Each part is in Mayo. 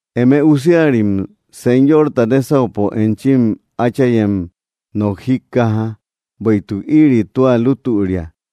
Eme usiarim, Señorta nésaupo enchim áchayem nok jíkkaja, bueïtuk ïri tua lútüria.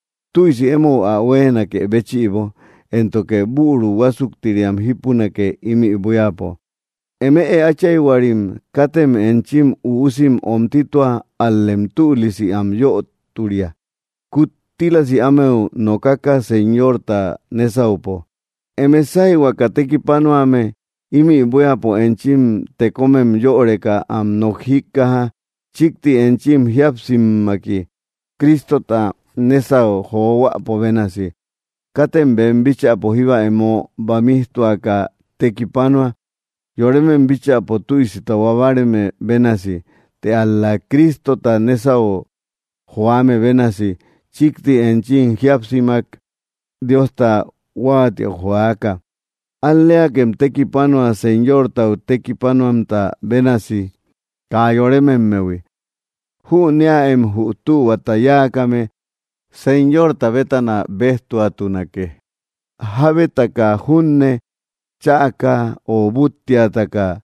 tüisi emou ä huéenakë béchïbo, éntoke büru huásuktiriam jípunake, ímï buíapo.” Eme áchayhuarim, katem enchim üusim omtitua, ál‑lem tülisi am yöturia, kuttílasi ámeu nokaka, Señorta nésaupo. Eme sáyhuaka tekipanuame ímï buíapo enchim tekomem yöreka am nok jíkkaja, chíkti enchim jíapsimmaki, Cristota nésau johuäpo bénasi. Katem bem bíchäpo jíba emo bamijtuaka tekipanua, yoremem bíchäpo tüisi tahua báareme bénasi; të ál‑la Cristota nésau joame bénasi, chíkti enchim jíapsimak Diosta huáatiäu joaka. Al‑leakem tekipanua, Señortau tekipanuamta bénasi, kaa yorememmehui. Jünëaem, jü tühuata yáakame Señorta bétana béjtuatunake, jábetaka junne chäka ö búttiataka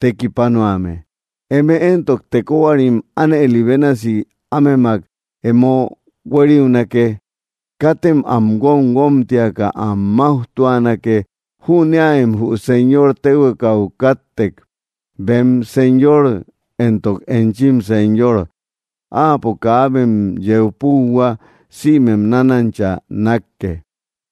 tekipanuame. Eme éntok, tekohuarim, ánëli bénasi ámemak emo huériunake, katem am guomguomtiaka am máujtuanake. Jüneäem jü Señor téhuekau káttek, bem Señor entok enchim Señor. Áapo kaabem yeu púuhua; sïmem nánancha nákke.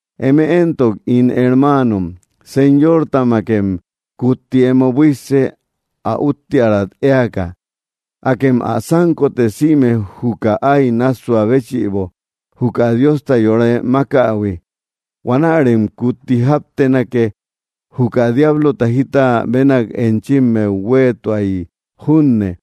Eme éntok, ín hermaanon, Señortamakem kutti emo buísse, ä úttiärat éaka. Akem ä sánkote, sïme juka áy nássua béchïbo juka Diosta yore mákähui. Huanärem kutti jáptenake, juka diablota jita bénak enchimmeu huéetuay junne.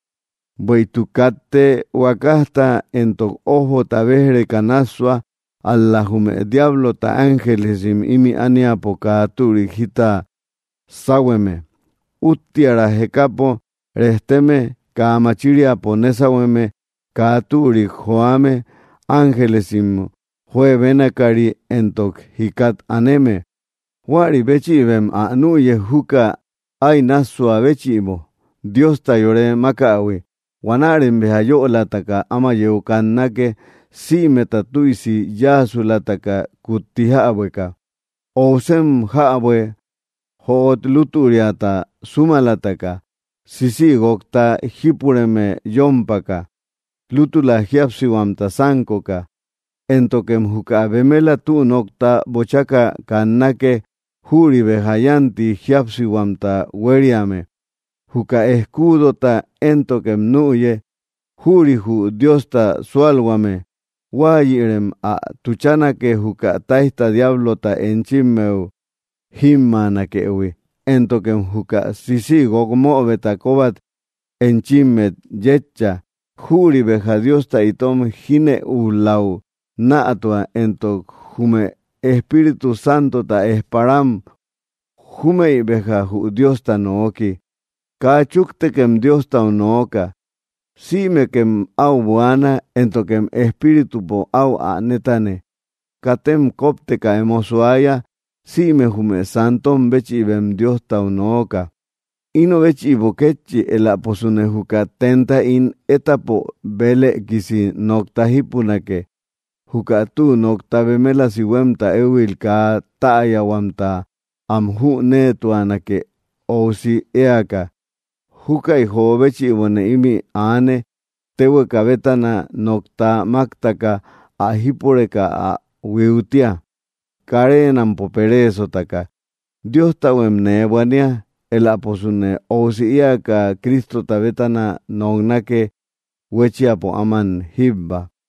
Bueïtuk katte huakajta entok ójbota béj‑reka nássua; ál‑la jume diablota ángelesim ímï ániapo kaa türik jita sáhueme, úttiära jekapo rejteme, kaa machiriapo nésahueme, kaa türik joame, ángelesim juebénakari entok jikat aneme. Huäri béchïbem ä nüye, juka áy nássua béchïbo, Diosta yore mákähui. Huanärem béja yölataka áma yeu kannake, sïmeta tüisi yáasulataka kutti jäbueka. Óusem jäbue, jöot lútüriata súmalataka, sisïguokta jípureme yómpaka, lútula jíapsihuamta sánkoka, éntokem juka bemela tü nokta bochaka kannake; jüri béja yánti jíapsihuamta huériame. Juka escuudota éntokem nüye, jüri jü Diosta súalhuame; huáyïrem ä tuchanake, juka táijta diablota enchimmeu jímmaanakëhui. Éntokem juka sisïguok möbeta kóbat enchimmet yétcha; jüri béja Diosta itom jínëuläu nätua. Entok jume Espíritu Santota ejparam; júmëi béja jü Diosta nooki. Kaa chúktekem Diostau nooka. Sïmekem áu buaana, éntokem Espíritupo áu ä nétane. Katem kópteka emo suaya. Sïme jume santom béchïbem Diostau nooka. Ino béchïbo kétchi; eläposune juka tenta ín étapo bélëkisi nokta jípunake. Juka tü nokta bemelasi huémta éhuil kaa täyahuamta am jüneetuanake, óusi éaka. Júkäi jo béchïbone ímï aane; téhueka bétana nokta máktaka ä jípureka ä huiutia, kareenampo pereesotaka. Diostahuem nee buania. Eläposune óusi éaka Cristota bétana noknake, huéchiapo áman jíbba.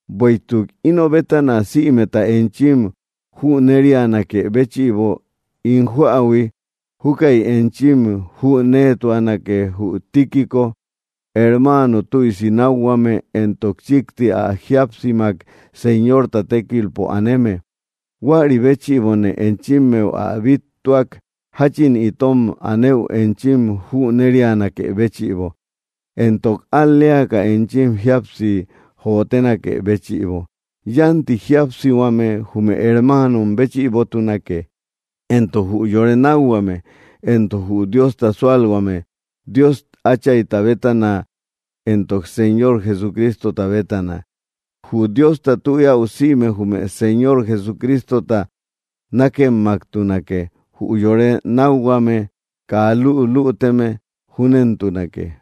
Bueïtuk ino bétana sïmeta enchim jünerianakë béchïbo, ín joähui, júkäi enchim jüneetuanake jü Tíquico, hermano tüisi nákhuame entok chíkti ä jíapsimak Señorta tékilpo aneme. Huäri béchïbone enchimmeu ä bíttuak, jáchin itom anëu enchim jünerianakë béchïbo, entok al‑leaka enchim jíapsi jóotenakë béchïbo. Yánti jíapsihuame jume hermanom béchïbotunake, entok jü yore nákhuame, entok jü Diosta súalhuame, Dios Áchayta bétana entok Señor Jesucristota bétana. Jü Diosta tü eäu sïme jume Señor Jesucristota nákemmaktunake, jü yore nákhuame kaa lülüteme. Júnentunake.